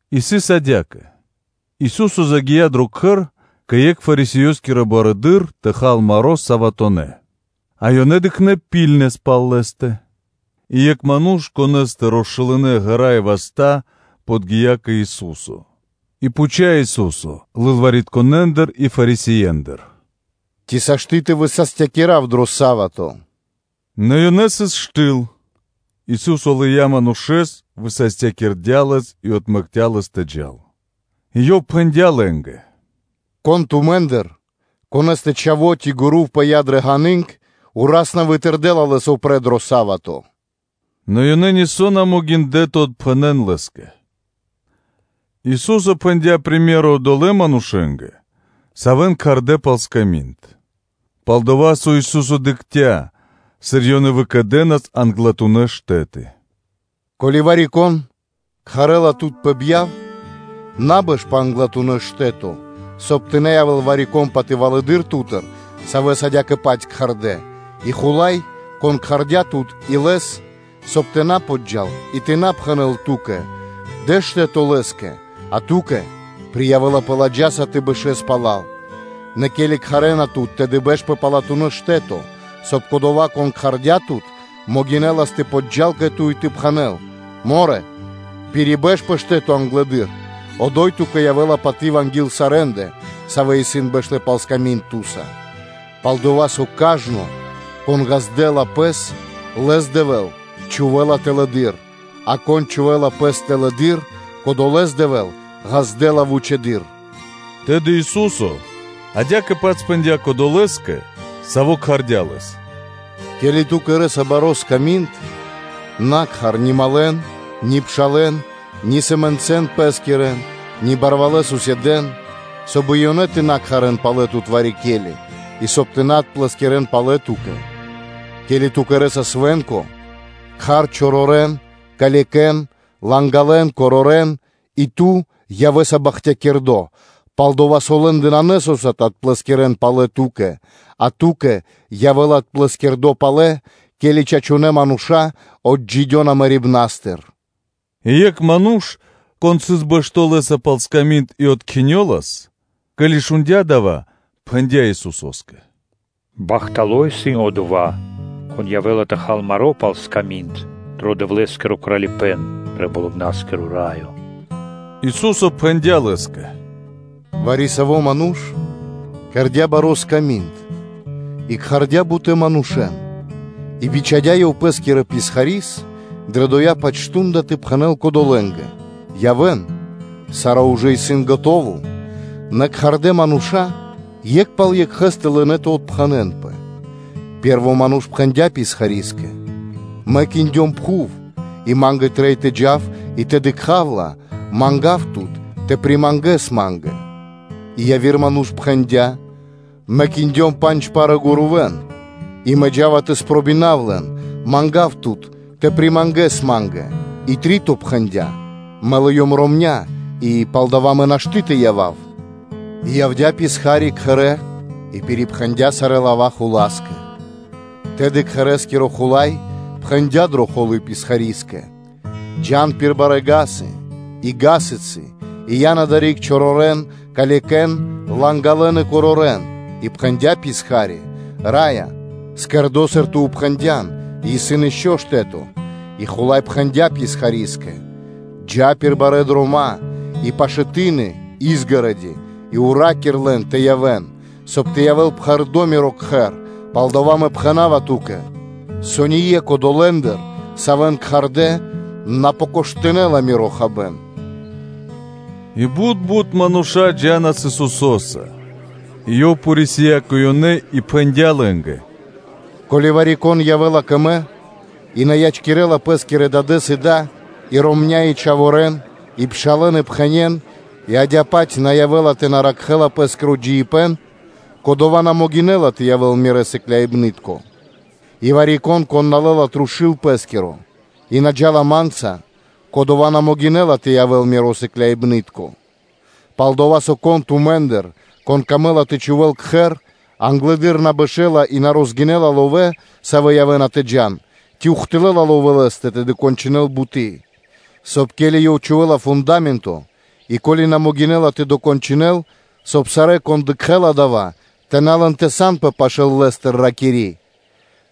И сыс адя́кэ: Ису́со загия́ дро кхэр кэ екх Фарисеёскиро барыдыро́ тэ хал маро́ саватонэ́ (суботонэ́), а ёнэ дыкхнэ́ дрэ сарэ́ якха́ пал Лэ́стэ. И екх ману́ш, конэ́стэ росшулынэ ґэра́ и васта́, подги́я кэ Ису́со. И пхуця́ Ису́со лылваритконэндыр и Фарисеендыр: “Ци сашты́ тэ высастякирав дро са́вато?” Нэ ёнэ сыс штыл. Ису́со лыя́ манушэ́с, высастякирдя́ лэс и отмэкця́ лэс тэ джал. И Ёв пхэндя́ лэ́нгэ: “Кон тумэ́ндыр, конэ́стэ о́сло (мега́ри) ци гурув пыя́ дрэ ґаны́нг, ураз на вытырдэла лэс упрэ́ дро са́вато?” Нэ ёнэ нисо́ на могиндлэ́ тэ отпхэнэн Лэ́скэ. Ису́со пхэндя́ притча одолэ́ манушэ́нгэ, савэ́н кхардэ́ пал сками́нд, пал-дова́ со Ису́со дыкхця́, сыр ёнэ выкэдэнас англатунэ́ штэ́ты: “Ко́ли вари-кон кхарэ́ла тут пэ бьяв, на бэш пэ англатуно́ штэ́то, соб (кай) тэ на явэ́л вари-кон патывалэдыр ту́тыр, савэ́с адя́кэ-паць кхардэ́, и хула́й, кон кхардя́ тут и лэс, соб (кай) тэ на подджа́л и тэ на пхэнэ́л ту́кэ: ‘Дэ штэ́то лэ́скэ,’ а ту́кэ приявэлапэ ладжаса тэ бэшэ́л пала́л. Нэ ке́ли кхарэ́на тут, тэды бэш пэ палатуно́ штэ́то, соб (кай) кодова́, кон кхардя́ тут, могинэлас тэ подджа́л кэ ту и тэ пхэнэ́л: ‘Морэ! Пирибэш пэ штэ́то англэды́р: одо́й ту́кэ явэ́ла паты́в анги́л сарэ́ндэ, савэ́ исын бэштэ́ пал сками́нд ту́са; пал-дова́ со кажно, кон ґаздэ́ла пэс, лэс Дэвэ́л чхувэ́ла тэлэды́р, а кон чхувэ́ла пэс тэлэды́р, кодолэ́с Дэвэ́л ґаздэ́ла вучэды́р.’” Тэ́ньци Ису́со адя́кэ-паць пхэндя́ кодолэ́скэ, саво́ кхардя́ Лэс: “Ке́ли ту кэрэ́са баро́ сками́нд, на кхар ни малэн, ни пшалэ́н, ни сэмэнцэн пэскирэн, ни барвалэ́ суседэн (котарье́н), соб (кай) и ёнэ тэ на кхарэ́н палэ тут вари-ке́ли, и соб (кай) тэ на отплэскирэн палэ ту́кэ. Ке́ли ту кэрэ́са свэ́нко, кхар чорорэн, калекэн, лангалэн, корорэн, и ту явэ́са бахтякирдо́: пал-дова́ со лэ́ндэ нанэ со́са тэ отплэскирэн палэ ту́кэ; а ту́кэ, явэ́ла отплэскирдо палэ, ке́ли чачунэ́ мануша́ отджидёна мэрибна́стыр. И екх ману́ш, кон сыс бэшто́ Лэ́са пал сками́нд и откхинёлас, ке́ли шундя́ дава́, то пхэндя́ Исусо́скэ: “Бахтало́ исын одова́ ману́ш, кон явэ́ла тэ хал маро́, пал сками́нд дро Дэвлэ́скиро Кралипэ́н дро Болыбна́скиро Раё.” Ису́со пхэндя́ Лэ́скэ: “Вари-саво́ ману́ш кэрдя́ баро́ сками́нд и кхардя́ бутэ́ манушэ́н. И бичхадя́ ёв пэ́скирэ писхари́с дрэ дова́-паць мардо́ тэ пхэнэ́л кодолэ́нгэ: ‘Явэ́н, саро́ ужэ исын скэдыно́’. Нэ кхардэ́ мануша́, екх пал екхэ́стэ, лынэ́ тэ отпхэнэнпэ. Пэ́рво ману́ш пхэндя́ писхари́скэ: ‘Мэ киндём пхув, и ма́нгэ трэй тэ джав и тэ дыкха́в ла; мангав тут тэ примангэс ма́нгэ’. И яви́р ману́ш пхэндя́: ‘Мэ киндём пандж пары гурувэ́н тэ дэн андрэ́, и мэ джа́ва тэ спробинав лэн; мангав тут тэ примангэс ма́нгэ’. И три́то пхэндя́: ‘Мэ лыём ромня́, и палдава́ ма́нгэ нашты́ тэ явав.” И явдя́ писха́ри кхэрэ́ и пирипхэндя сарэ́ лава́ хула́скэ. Тэды кхэрэ́скиро хула́й пхэндя́ дрэ холы́ писхари́скэ: ‘Джа́н пир барэ́ вули́цы (га́сы) и гасыцы, и ян адари́к чорорэн, калекэн, лангалэн и корорэн’. И пхэндя́ писха́ри: ‘Раё, кэрдо́, сыр ту пхэндя́н зорья́са, и исын ишчо (инкэ́) штэ́то’. И хула́й пхэндя́ писхари́скэ: ‘Джа́ пир барэ́ дрома́ и пашэ́ ты́ны (изгороди) и ра́кир пир ило́ лэ́нгэ тэ явэ́н, соб (кай) тэ явэ́л пхэрдо́ миро кхэр; палдава́ Мэ пхэна́ва ту́кэ, со ние́кх одолэ́ндыр, савэ́н кхардэ́, на покоштынэла (на спробинэла) миро хабэ́н.’” И бут бут мануша́ джа́нас Исусо́са и Ёв порисия кэ ёнэ и пхэндя́ лэ́нгэ: “Ко́ли вари-кон явэ́ла кэ Мэ и на ячкирэ́ла пэ́скирэ дадэ́с и да, и ромня́, и чхаворэ́н, и пшалэ́н, и пхэнен, и адя́кэ-паць на явэ́ла тэ ракхэ́л пэ́скиро джиибэ́н; кодова́ на могинэ́ла тэ явэ́л Миро сыкляибны́тко; и вари-кон, кон на лэ́ла трушу́л пэ́скиро и на джа́ла Ма́нца, кодова́ на могинэ́ла тэ явэ́л Миро сыкляибны́тко. Пал-дова́ со, кон тумэ́ндыр, саво́ камэ́ла тэ чхувэ́л кхэр, англэды́р на бэшэ́ла и на розгинэла ловэ́, со явэ́ла мол дава́, ци ухты́лла (до́си) ловэ́ лэ́стэ тэ докончынэл буты́; соб (кай), ке́ли ёв чхувэ́ла фунда́менто и ко́ли на могинэ́ла тэ докончынэл, соб (кай) сарэ́, кон дыкхэ́ла дава́, тэ на лэн тэ санпэ лэ́стыр; ракири́: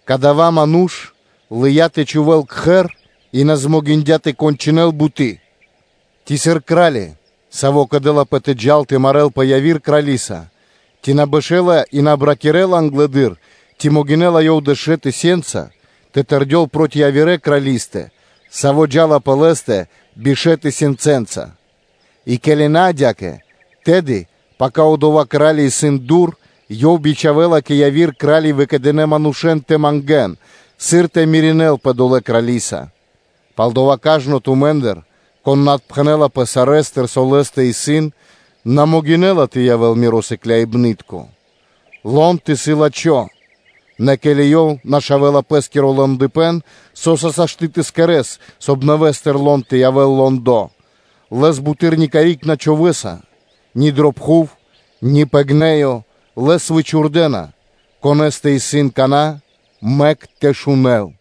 ‘Кадава́ ману́ш лыя́ тэ чхувэ́л кхэр и на дыя́ ра́да (змогиндя) тэ докончынэл буты́?’ Ци, сыр кра́ли, саво́ кэдэлапэ тэ джал тэ марэ́лпэ явирэ крали́са, ци на бэшэ́ла ёв и на обракирэла англэды́р, ци могинэ́ла ёв дэшэ тысёнцэнца тэ тэрдёл проти явирэ крали́стэ, саво́ джа́ла пэ лэ́стэ бишэ́ тысёнцэнца? И ке́ли на адя́кэ, тэды пака одова́ кра́ли исын дур, ёв бичхавэ́ла кэ яви́р кра́ли выкэдынэ́ манушэ́н тэ мангэ́н, сыр тэ кэрэ́л рама́нё (миринэлпэ) долэ́ крали́са. Палдава́ кажно тумэ́ндыр, кон на отпхэнэлапэ сарэ́стыр, со лэ́стэ исын, на могинэ́ла тэ явэ́л Миро сыкляибны́тко. Лонд исын лачхо́, нэ ке́ли ёв нашавэла пэ́скиро лондыпэн, со́са сашты́ тэ кэрэ́с, соб (кай) нэвэ́стыр лонд тэ явэ́л лондо? Лэс буты́р ни карик на чхувэ́са: ни дрэ пхув, ни пэ гнэё; лэс вычхурдэна. Конэ́стэ исын кана́, мэк тэ шунэ́л.”